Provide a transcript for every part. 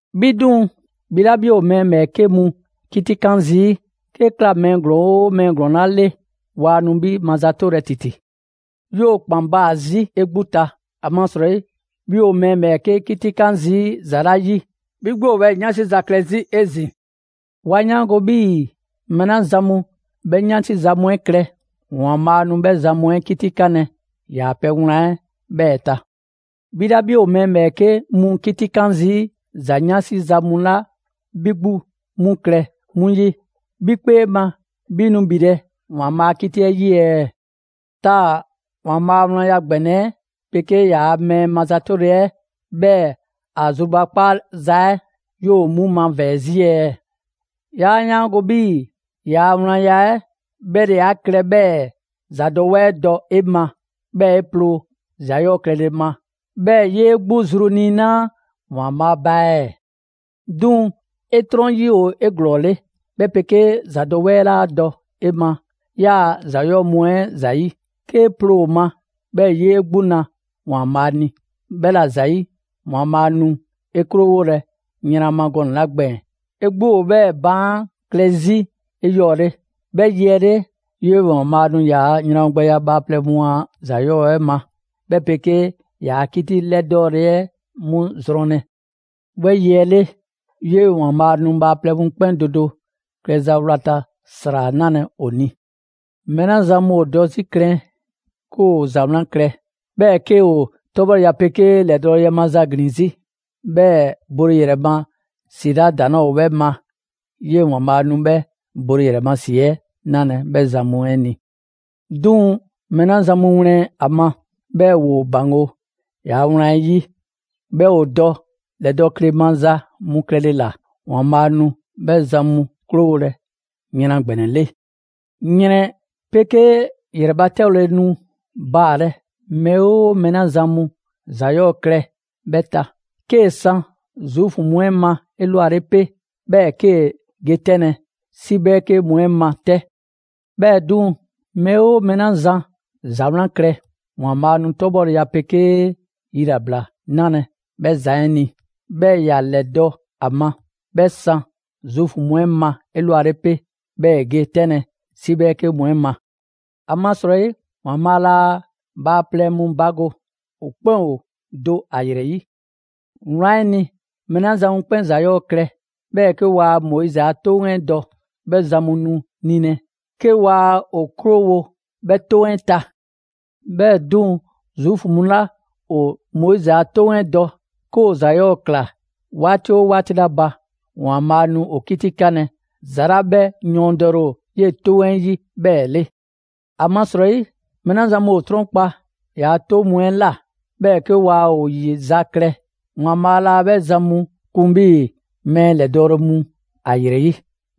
'Bhi 'duŋ‑, 'bhi 'la 'bhi ‑o mɛɛ ‑bhɛɛke' mu 'kitikan zii', 'kee‑ ꞊kla mɛɛ ‑glɔɔn 'oo mɛɛ ‑glɔɔn 'la 'le, waa nu 'bhi mazatolɛ ‑titi. 'Yoo‑ ‑kpan baa‑ 'zi 'e 'gbu ta, ‑amasrɔyi 'bhi ‑o mɛɛ ‑bhɛɛke' 'kitikan zii' ‑za 'la 'yi, 'bhi 'gbu ‑o 'bhɛɛ‑ 'yansi za klɛ 'zi 'ezin‑. 'Wa 'yaango‑ 'bhii‑ mɛɛ 'la zan mu 'bhɛ 'yansi za mu 'ɛ klɛ, ‑Waanbhaa' nu 'bhɛ zan mu 'ɛ 'kitikanlɛ ‑yaa' pɛ wlan 'ɛ 'bhɛɛ‑ ta. 'Bhi 'la 'bhi ‑o mɛɛ ‑bhɛɛke' mu 'kitikan zii' ‑za 'yansi mu 'la 'bhi 'gbu 'mu klɛ 'mu 'yi, 'bhi 'kpee ma 'bhi nu ‑bhilɛ' ‑Waanbhaa' a 'kiti 'ɛ 'yi ɛɛ? Taa‑ ‑Waanbhaa' a wlanya ‑gbɛnɛ 'ɛ 'pegee yaa mɛɛ mazatoza 'ɛ, 'bhɛɛ‑ ‑a zrubakpaaza 'ɛ, 'yoo‑ 'mu mavɛɛ‑ 'zi ɛɛ? 'Yaa 'yaango‑ 'bhii‑ ‑yaa' wlanya 'ɛ 'bhɛ ‑le 'a klɛ 'bhɛɛ‑ ‑zadɔwɛɛ dɔ 'e ma, 'bhɛɛ‑ 'e ploo ‑za 'yɔɔ‑ klɛle ma, 'bhɛɛ‑ 'yee 'gbu zru niinaa' ‑Waanbhaa' ba ɛɛ? 'Duŋ‑ 'e 'trɔn 'yi ‑o 'eglɔɔle, 'bhɛ 'pegee ‑zadɔwɛɛ 'laa dɔ 'e ma 'yaa‑ ‑za 'yɔɔ‑ mu 'ɛ ‑zayi', 'kee‑ ploo ‑o ma, 'bhɛɛ‑ 'yee 'gbu na ‑Waanbhaa' ni. 'Bhɛla‑ ‑zayi', ‑Waanbhaa' nu 'e 'krowolɛ yran ma gɔnɛ‑ 'la gbɛɛn‑, 'e 'gbu ‑o 'bhɛɛ‑ baan' klɛ 'zi 'eyɔɔle. 'Bhɛ yi 'ɛ 'le, 'yee‑ ‑Waanbhaa' nu ‑yaa' ‑yranwogbɛya bhaaplɛŋ mu a ‑za 'yɔɔ‑ 'ɛ ma 'ɛ, 'bhɛ 'pegee ‑yaa' 'kiti 'lɛdɔɔle 'ɛ 'mu zrɔnlɛ. 'Bhɛ yi 'ɛ 'le, 'yee‑ ‑Waanbhaa' nu bhaaplɛŋ mu 'kpɛn do do klɛza wlata ‑sra 'nalɛ‑ ‑o ni. Mɛɛ 'la zan mu ‑o dɔ 'zi klɛn 'ke ‑o ‑za 'wlan klɛ, 'bhɛɛ‑ 'ke ‑o 'tɔbhɔleya 'pegee ‑o ‑lɛdɔle a ma ‑glin 'zi, 'bhɛɛ‑ bole ‑yrɛ ma ‑si 'la ‑daŋ' 'laa ‑o 'bhɛ ma, 'yee‑ ‑Waanbhaa' nu 'bhɛ bole ‑yrɛ ma ‑si 'ɛ 'nalɛ‑ 'bhɛ zan mu 'ɛ ni. 'Duŋ‑ mɛɛ 'la zan mu wlɛn ‑a ma, 'bhɛɛ‑ ‑woo ‑baŋgo' ‑yaa' wlan 'ɛ 'yi, 'bhɛɛ‑ ‑o dɔ ‑lɛdɔɔkleya maza mu klɛle ‑la; ‑Waanbhaa' nu 'bhɛ zan mu 'krowolɛ yran ‑gbɛnɛ 'le. ‑Yrɛn 'pegee ‑yrɛbatɛdɔle nu baalɛ mɛɛ 'oo mɛɛ 'la zan ‑za 'yɔɔ‑ klɛ 'bhɛ ta: 'kee‑ san Zuufu mu 'ɛ ma 'elwale 'pe, 'bhɛɛ‑ 'kee‑ ge 'tɛnlɛ‑ 'si 'bhɛɛke mu 'ɛ ma 'tɛ. 'Bhɛɛ‑ 'duŋ‑, mɛɛ 'oo mɛɛ 'la zan ‑za 'wlan klɛ, ‑Waanbhaa' nu 'tɔbhɔleya 'pegee yilabla 'nalɛ‑ 'bhɛ zan 'ɛ ni, 'bhɛɛ‑ ‑ya ‑lɛdɔ' ‑a ma: 'bhɛ san Zuufu mu 'ɛ ma 'elwale 'pe, 'bhɛɛ‑ ‑e ge 'tɛnlɛ‑ 'si 'bhɛɛke mu 'ɛ ma. ‑Amasrɔyi ‑Waanbhaa' 'laa bhaaplɛŋ mu bago; ‑o 'kpɛn ‑o do ‑a ‑yrɛ 'yi. Wlan 'ɛ ni, mɛɛ 'la zan mu 'kpɛn ‑za 'yɔɔ‑ klɛ, 'bhɛɛ‑ 'ke waa Moizi a 'Toŋ 'ɛ dɔ; 'bhɛ zan mu nu nilɛ 'ke waa ‑o 'krowo‑ 'bhɛ 'toŋ 'ɛ ta. 'Bhɛɛ‑ 'duŋ‑, Zuufu mu 'la ‑o Moizi a 'Toŋ 'ɛ dɔ, 'ke ‑o ‑za 'yɔɔ‑ ꞊kla 'waati 'oo 'waati 'la ba, ‑Waanbhaa' nu ‑o 'kitikanlɛ ‑za 'la 'bhɛ yɔɔndɛle ‑o 'yee‑ 'Toŋ 'ɛ 'yi 'bhɛɛ‑ 'le. ‑Amasrɔyi mɛɛ 'la zan mu ‑o 'trɔnkpa‑ ‑yaa' 'toŋ mu 'ɛ ꞊la, 'bhɛɛ‑ 'ke waa ‑o ‑yizaklɛ; ‑Waanbhaa' laa 'bhɛ zan mu kun 'bhii‑ mɛɛ ‑lɛdɔɔle mu ‑a ‑yrɛ 'yi.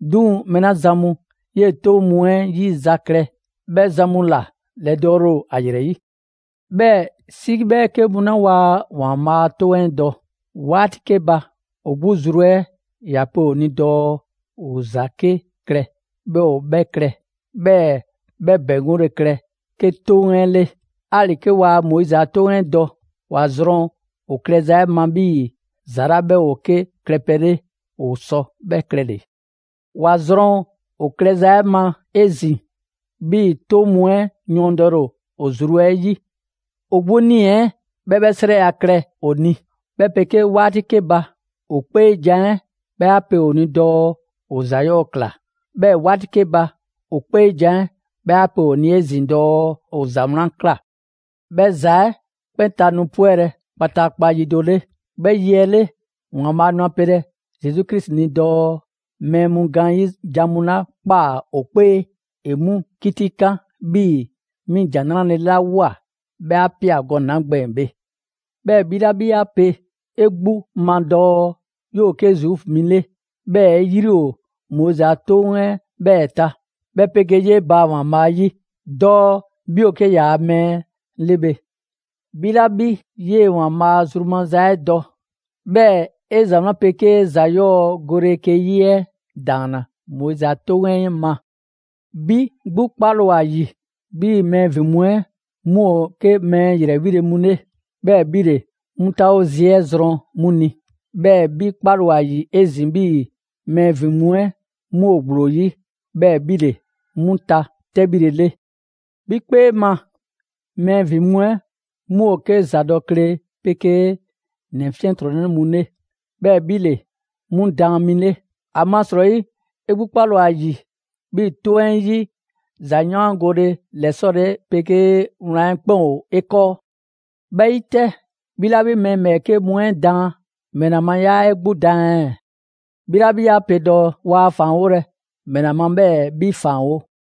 'Duŋ‑ mɛɛ 'la zan mu 'yee‑ 'toŋ mu 'ɛ 'yizaklɛ, 'bhɛ zan mu ‑la ‑lɛdɔɔle ‑o ‑a ‑yrɛ 'yi. 'Bhɛɛ‑ 'si 'bhɛɛke mu 'la waa ‑Waanbhaa' a 'toŋ 'ɛ dɔ; 'waati 'ke ba, ‑o 'gbu zru 'ɛ ‑ya pe ‑o ni dɔɔ ‑o ‑za 'ke klɛ, 'bhɛɛ‑ ‑o 'bhɛ klɛ, 'bhɛɛ 'bhɛ ‑bɛŋgole klɛ 'ke 'toŋ 'ɛ 'le. 'Ali‑ 'ke waa Moizi a 'Toŋ 'ɛ dɔ, ‑wa zrɔn ‑o klɛza 'ɛ ma 'bhii‑ ‑za 'la 'bhɛ ‑o 'ke klɛpɛ 'le, ‑o sɔ 'bhɛ klɛle‑. ‑Wa zrɔn ‑o klɛza 'ɛ ma 'ezin‑ 'bhii‑ 'toŋ mu 'ɛ yɔɔndɛle ‑o ‑o zru 'ɛ 'yi. ‑O 'gbu 'nii‑ 'ɛ 'bhɛ 'bhɛ 'srɛya‑ klɛ ‑o ni, 'bhɛ 'pegee 'waati 'ke ba, ‑o 'kpeejan‑ 'ɛ 'bhɛ 'a pe ‑o ni dɔɔ ‑o ‑za 'yɔɔ‑ ꞊kla, 'bhɛɛ‑ 'waati 'ke ba, ‑o 'kpeejan‑ 'ɛ 'bhɛ 'a pe ‑o ni 'ezin‑ dɔɔ ‑o ‑za 'wlan ꞊kla. 'Bhɛ ‑za 'ɛ 'kpɛn ta nu 'pwɛlɛ‑ kpataakpa yi do 'le. 'Bhɛ yi 'ɛ 'le, ‑Waanbhaa' nu a pelɛ Zesu Krisi ni dɔɔ mɛɛ mu gaanyi' jan mu 'la ꞊kpaa ‑o 'kpee ‑e 'mu 'kitikan 'bhii‑ 'mi ‑Jan 'Nrale‑ 'la ꞊woa 'bhɛ 'a ꞊pia gɔnɛ‑ 'la gbɛɛn‑ bhe. 'Bhɛɛ‑ 'bhi 'la 'bhi 'a pe 'e 'gbu ma dɔɔ 'yoo‑ 'ke Zuufu mi 'le, 'bhɛɛ‑ 'e 'yri ‑o Moizi a 'Toŋ 'ɛ 'bhɛɛ‑ ta, 'bhɛ 'pegee 'yee‑ baa‑ ‑Waanbhaa' 'yi dɔɔ 'bhi ‑o 'ke ‑yaa mɛɛ 'le bhe. 'Bhi 'la 'bhi 'yee‑ ‑Waanbhaa' zru maza 'ɛ dɔ, 'bhɛɛ‑ 'e ‑za 'wlan 'pegee ‑za 'yɔɔ‑ gole 'ke 'yi 'ɛ ‑daanna Moizi a 'Toŋ 'ɛ ma. 'Bhi 'gbu 'kpale‑ ‑o ‑a ‑yi 'bhii‑ mɛɛ ‑vin mu 'ɛ 'mu ‑o 'ke mɛɛ ‑yrɛ 'wile‑ mu 'le, 'bhɛɛ‑ 'bhi ‑le 'mu 'taawo zi 'ɛ zrɔn 'mu ni; 'bhɛɛ‑ 'bhi 'kpale‑ ‑o ‑a ‑yi 'ezin‑ 'bhii‑ mɛɛ ‑vin mu 'ɛ 'mu ‑o ‑gblo 'yi, 'bhɛɛ‑ 'bhi ‑le 'mu ta 'tɛbhile 'le. 'Bhi 'kpee ma mɛɛ ‑vin mu 'ɛ 'mu ‑o 'ke ‑zadɔkle 'pegee ‑nɛ 'fiɛntrɔnnɛ mu 'le, 'bhɛɛ‑ 'bhi ‑le 'mu daan mi 'le; ‑amasrɔyi 'e 'gbu 'kpale‑ ‑o ‑a ‑yi 'bhii‑ 'toŋ 'ɛ 'yi ‑zayaangole ‑lɛsɔle 'pegee wlan 'ɛ 'kpɛn ‑o 'e 'kɔɔ. 'Bhɛ 'yi 'tɛ, 'bhi 'la mɛɛ ‑bhɛɛke' mu 'ɛ daan, ‑mɛla ma 'yaa 'e 'gbu daan ɛɛ? 'Bhi 'la 'bhi 'a pe dɔɔ waa ‑faanwolɛ, ‑mɛla ma 'bhɛɛ‑ 'bhi ‑faanwo'?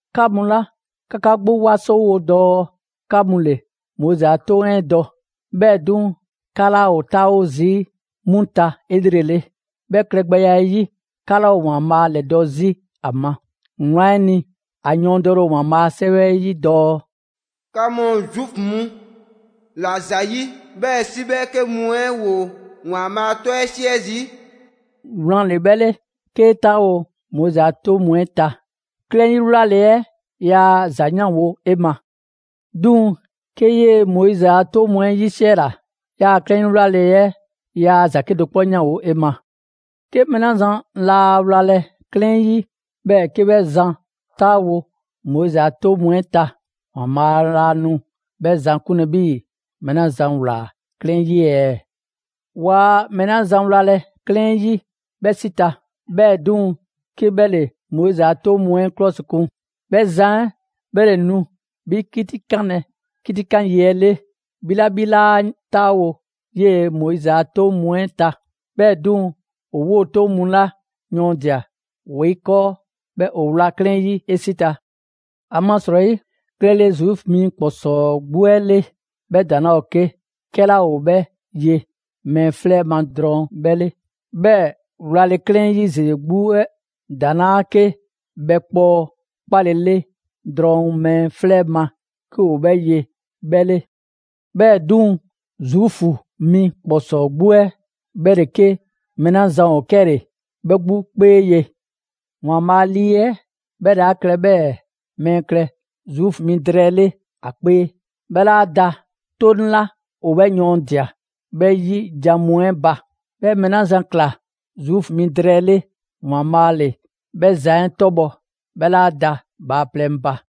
'Ka mu 'la 'ka 'ka 'gbu 'wasowo dɔɔ 'ka mu ‑le Moizi a 'toŋ 'ɛ dɔ; 'bhɛɛ‑ 'duŋ‑ 'ka 'laa ‑o 'taawo zii' 'mu ta 'elrele. 'Bhɛ klɛgbɛya 'ɛ 'yi, 'ka 'laa ‑o ‑Waanbhaa' ‑lɛdɔ' 'zi ‑a ma. Wlan 'ɛ ni, a yɔɔndɛle ‑o ‑Waanbhaa' a 'Sɛwɛ 'ɛ 'yi dɔɔ: «'Ka mu Zuufu mu ‑la ‑zayi' 'bhɛɛ‑ 'si 'bhɛɛke mu 'ɛ ‑woo ‑Waanbhaa' 'tɔ 'ɛ 'siɛ zii'.» Wlan ‑le 'bhɛ 'le, 'kee 'taawo‑ Moizi a 'toŋ mu 'ɛ ta, 'klɛɛn 'yi wlale 'ɛ ‑za 'yanwo‑ 'e ma. 'Duŋ‑ 'kee 'yee‑ Moizi a 'toŋ mu 'ɛ 'yisiɛla, 'yaa‑ 'klɛɛn 'yi 'wlale‑ 'ɛ yaa ‑za 'kedo‑ 'kpɔ 'yanwo‑ 'e ma. 'Ke mɛɛ 'la zan laa wlalɛ 'klɛɛn 'yi, 'bhɛɛ‑ 'ke 'bhɛ zan 'taawo‑ Moizi a 'toŋ mu 'ɛ ta; ‑Waanbhaa' laa nu 'bhɛ zan 'kunlɛ‑ 'bhii‑ mɛɛ 'la zan ꞊wlaa 'klɛɛn 'yi ɛɛ? Waa mɛɛ 'la zan wlalɛ 'klɛɛn 'yi 'bhɛ 'si ta, 'bhɛɛ‑ 'duŋ‑ 'ke 'bhɛ ‑le Moizi a 'toŋ mu 'ɛ 'klɔsikun; 'bhɛ zan 'ɛ 'bhɛ ‑le nu 'bhi 'kitikanlɛ 'kitikan yi 'ɛ 'le, 'bhi 'la 'bhi 'laa 'taawo‑ 'yee‑ Moizi a 'toŋ mu 'ɛ ta. 'Bhɛɛ‑ 'duŋ‑, ‑o 'woo‑ 'toŋ mu 'la yɔɔndia‑ ‑woo 'e 'kɔɔ, 'bhɛɛ‑ ‑o wla 'klɛɛn 'yi 'e 'si ta. ‑Amasrɔyi, klɛle Zuufu mi ‑kpɔsɔɔ 'gbu 'ɛ 'le, 'bhɛ ‑daŋ' 'laa ‑o 'ke 'kɛla ‑o 'bhɛ ye mɛɛ 'flɛ ma drɔŋ 'bhɛ 'le. 'Bhɛɛ‑ wlale 'klɛɛn 'yi ‑zeze 'gbu 'ɛ ‑daŋ' 'laa 'ke bhɛkpɔɔ 'kpalele drɔŋ mɛɛ 'flɛ ma 'ke ‑o 'bhɛ ye 'bhɛ 'le. 'Bhɛɛ‑ 'duŋ‑, Zuufu mi ‑kpɔsɔɔ 'gbu 'ɛ 'bhɛ ‑le 'ke mɛɛ 'la zan ‑o 'kɛle‑ 'bhɛ 'gbu 'kpee ye. ‑Waanbhaa' Lii 'ɛ 'bhɛ ‑le 'a klɛ 'bhɛɛ‑ mɛɛ klɛ Zuufu mi drɛɛ 'le ‑a 'kpee; 'bhɛ 'laa da 'Toŋ 'la ‑o 'bhɛ yɔɔndia꞊ 'bhɛ 'yi jan mu 'ɛ ba. 'Bhɛ mɛɛ 'la zan ꞊kla Zuufu mi drɛɛ 'le, ‑Waanbhaa' ‑le 'bhɛ zan 'ɛ 'tɔbhɔ‑, 'bhɛ 'laa da bhaaplɛŋ ba.